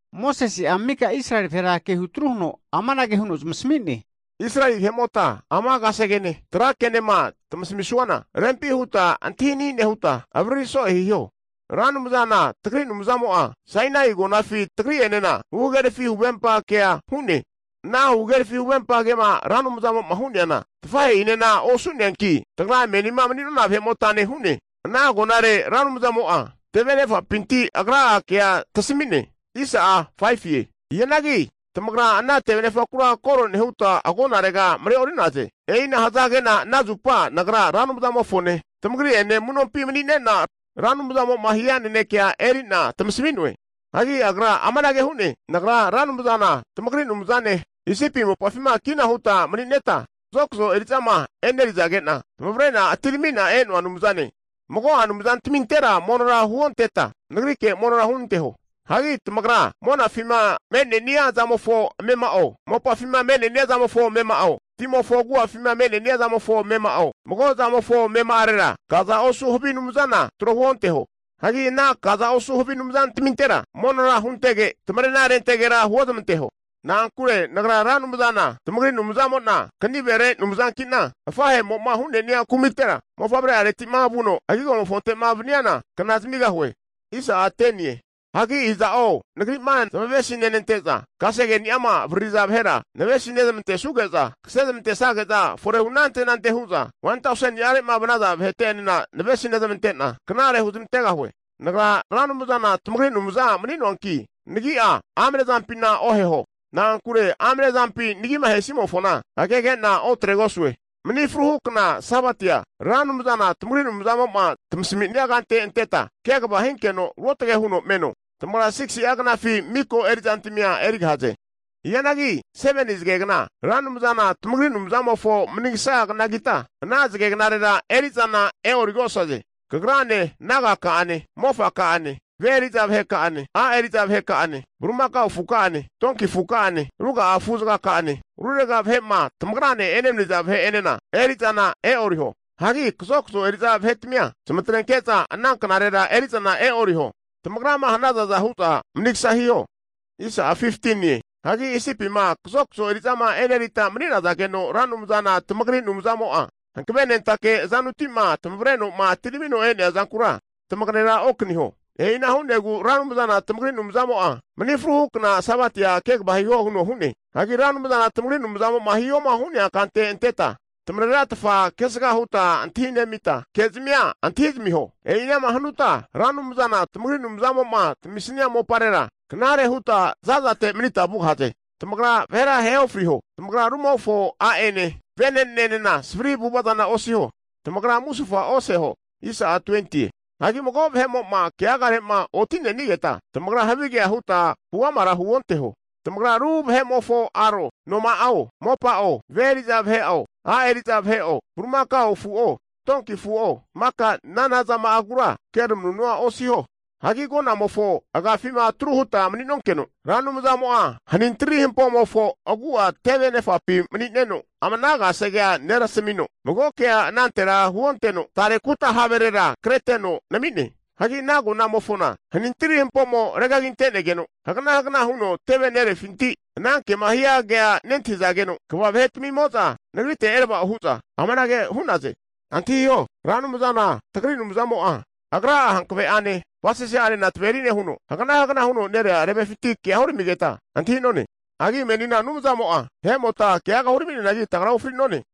Mosese'a mika Israeli vahera kehutru huno amanage huno zamasami'ne, Israeli vahe'mota ama kasegene trakenema tamasamisuana rempi huta antahini nehuta avariri so'e hiho. Ra Anumzana tagri Anumzamo'a Sainai agonafi tagri'enena huhagerafi huvempa kea hu'ne. Ana huhagerafi huvempa kema Ra Anumzamo'ma hu'neana tafahe'inena osu'neanki, tagra menima mani'nona vahe'motane hu'ne. Ana agonare Ra Anumzamo'a teve anefapinti Agra'a kea tamasmi'ne. Hianagi tamagra ana tevenefakura koro nehuta, agonarega mareori'naze. E'ina' hazage'na ana zupa nagra Ra Anumzamofone tamagri'ene amu'nompi mani'nena Ra Anumzamo'ma hia nenekea eri'na tamasami'noe. Hagi Agra amanage hu'ne, Nagra Ra Anumzana tamagri Anumzane, Isipi mopafima kina huta mani'neta kazokazo eri'zama e'nerizage'na tamavare atiramina e'noa Anumzane. Mago'a anumzantamintera monora huonteta Nagrike monora hunanteho. Hagi tamagra monafima me'nenia zamofo amema'o, mopafi me'nenia zamofo amema'o, timofo agu'afima me'nenia zamofo amema'o mago'zamofo amema'arera kaza osu havi anumzana tro huonteho. Hagi ana kaza osu havi anumzantamintera monora huntege, tamarena rentegera huozmanteho. Na'ankure Nagra Ra Anumzana tamagri Anumzamo'na kanivere Anumzankina, afahe'mo'ma hu'nenia kumitera mofavre'areti'ma vuno agigomofonte'ma vaniana kna zamigahue. Hianagi iza'zo Nagri'ma zamavesi nenante'za kasegeni'ama nevariri'za vahera, navesi nezamantesuge'za kasezamantesage'za forehu anante anante hu'za 1,0000ni'a vanaza vahete enena navesi nezamante'na, knare huzmantegahue. Nagra Ra Anumzana tamagri Anumaza mani'noanki Nagi'a amne zampina oheho. Na'ankure amnezampima nagima ahesimofona agegena otregosue. Mani fruhu kna Sabatia, Ra Anumzana tamagri Anumzamo'ma tamasami'nea kante anteta kegava hinkeno ruotge huno meno. Tamagra 6si'a zagegnafi miko eri'zantmia erigahaze. Hianagi 7ni zagegna Ra Anumzana tamagri Anumzamofo manigsa hu knagita, ana zagegnarera eri'zana e'origosaze. Kagrane, neka'ane, mofaka'ane, ve eri'za vaheka'ane, a' eri'za vaheka'ane, bulimakao afuka'ane, donki afuka'ane, ruga'a afuzagaka'ane, rurega vahe'ma tamagrane enemaniza vahe'enena eri'zana e'oriho. Hagi kazokazo eri'za vahetamia zamatrenke'za ana knarera eri'zana e'ori tamagrama hanazaza hu'za manigasa hiho. Hagi Isipima kazokazo eri'zama e'nerita mani'nazageno Ra Anumzana tamagri Anumzamo'a hanavenentake azanuti'ma tamavreno'ma atiramino e'nea zankura tamagera okaniho. E'ina hu'negu Ra Anumzana tamagri Anumzamo'a mani fruhu kna Sabatia kegava hiho hu'ne. Hagi Ra Anumzana tamagri Anumzamo'ma hihoma hu'nea kante anteta tamarera tamafana kesaga huta antahinezamita, ke'zamia antahizamiho. E'ina'ma hanuta Ra Anumzana tamagri Anumzamo'ma tamisia moparera knare huta za'zate manita vugahaze. Tamagra vahera ahe ofriho. Tamagra rumofo a'ene venenenena savri avu'vazana osiho. Tamagra musufa oseho. Hagi mago vahe'mo'ma keagare'ma oti'nenigeta tamagra havigea hutma huamara huonteho. Tamagra ru vahe'mofo aro, noma'o, mopa'o, ve eri'za vahe'o, a' eri'za vahe'o, bulimakao afu'o, donki afu'o, maka nanazama'agura keramanunua osiho. Hagi agonamofo agafima atru huta mani'nonkeno, Ra Anumzamo'a hanintiri hampomofo agu'a teve nefapi mani'neno ranke huno ama ana kasegea neramasamino, mago kea anantera hunonteno, tare kuta haverera kreteno nami'ne. Hagi ana agonamofona hanintiri hampomo regaginte'negeno hagana hagana huno teve nerefinti ana kema hia kea nentahizageno kva vahe'tmimo'za nagrite erava'o hu'za, amanage hu'naze, Antahio, Ra Anumzana tagri Anumzamo'a agra'a hankave'ane avasase'anena taveri nehuno hagana hagana huno nerea tevefinti keaga huramigeta antahi'none. Hagi menina Anumzamo'a vahe'mota keaga huramianagi tagra ofri'none.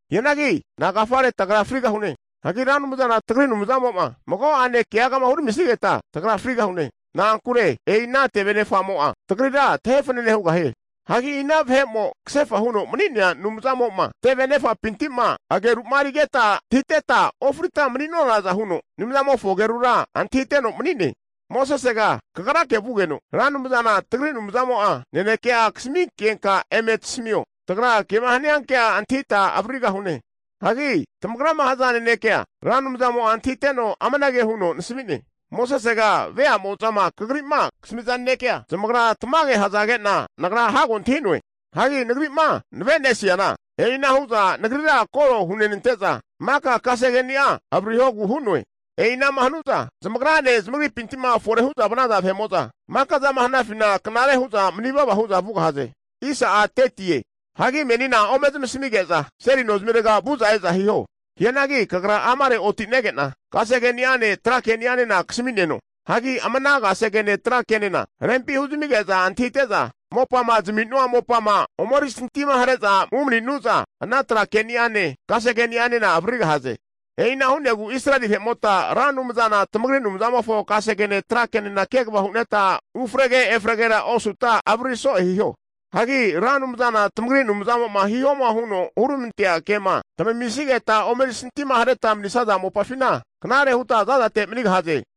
Hianagi nagafare tagra frigahune? Hagi Ra Anumzana tagri Anumzamo'ma mago ane keagama huramisigeta tagra frigahune. Na'ankure e'i ana teve nefa'mo'a tagrira tefanane hugahie. Hagi ina vahe'mo kasefa huno mani'nea Anumzamo'ma tevenefa'pinti'ma ageru'marigeta antahiteta ofrita mani'nonaza huno Anumzamofo agerura antahiteno mani'ne? Mosesega kagrake vugeno Ra Anumzana tagri Anumzamo'a nanekea kasaminkenka eme tasamio. Tagra kema haniankea antahita avaririgahune. Hagi tamagrama haza nanekea Ra Anumzamo'a antahiteno amanage huno nasami'ne. Mosesega vea'mo'zama kagri'ma kasamiza nanekea zamagra tamage hazage'na Nagra hago antahi'noe. Hagi Nagri'ma nave'nesiana, e'ina hu'za Nagrira koro hunenante'za maka kasegeni'a avaririhogu hu'noe. E'inama hanu'za zamagrane zamagripinti'ma fore hu'za vanaza vahe'mo'za maka zama hanafina knare hu'za mani vava hu'za vugahaze. Hagi menina ome zamasmige'za seli nozimirega vu'za e'za hiho. Hianagi kagra amare otinege'na kasegeni'ane tra keni'anena kasami'neno. Hagi ama ana kasegene tra kenena rempi huzamige'za antahite'za mopama zami'nua mopama omerisantima hare'za umaninu'za ana tra keni'ane kasegenianena avaririgahaze. E'i ana hu'negu Israel vahe'mota Ra Anumzana tamagri Anumzamofo kasegene trakenena kegava huneta ufrege efregera osuta avariri so'e hiho. Hagi Ra Anumzana tamagri Anumzamo'ma hihoma huno huramantea kema avaririsuta, tamamisigeta omeri santimahareta manisaza mopafina knare huta zazate manigahaze.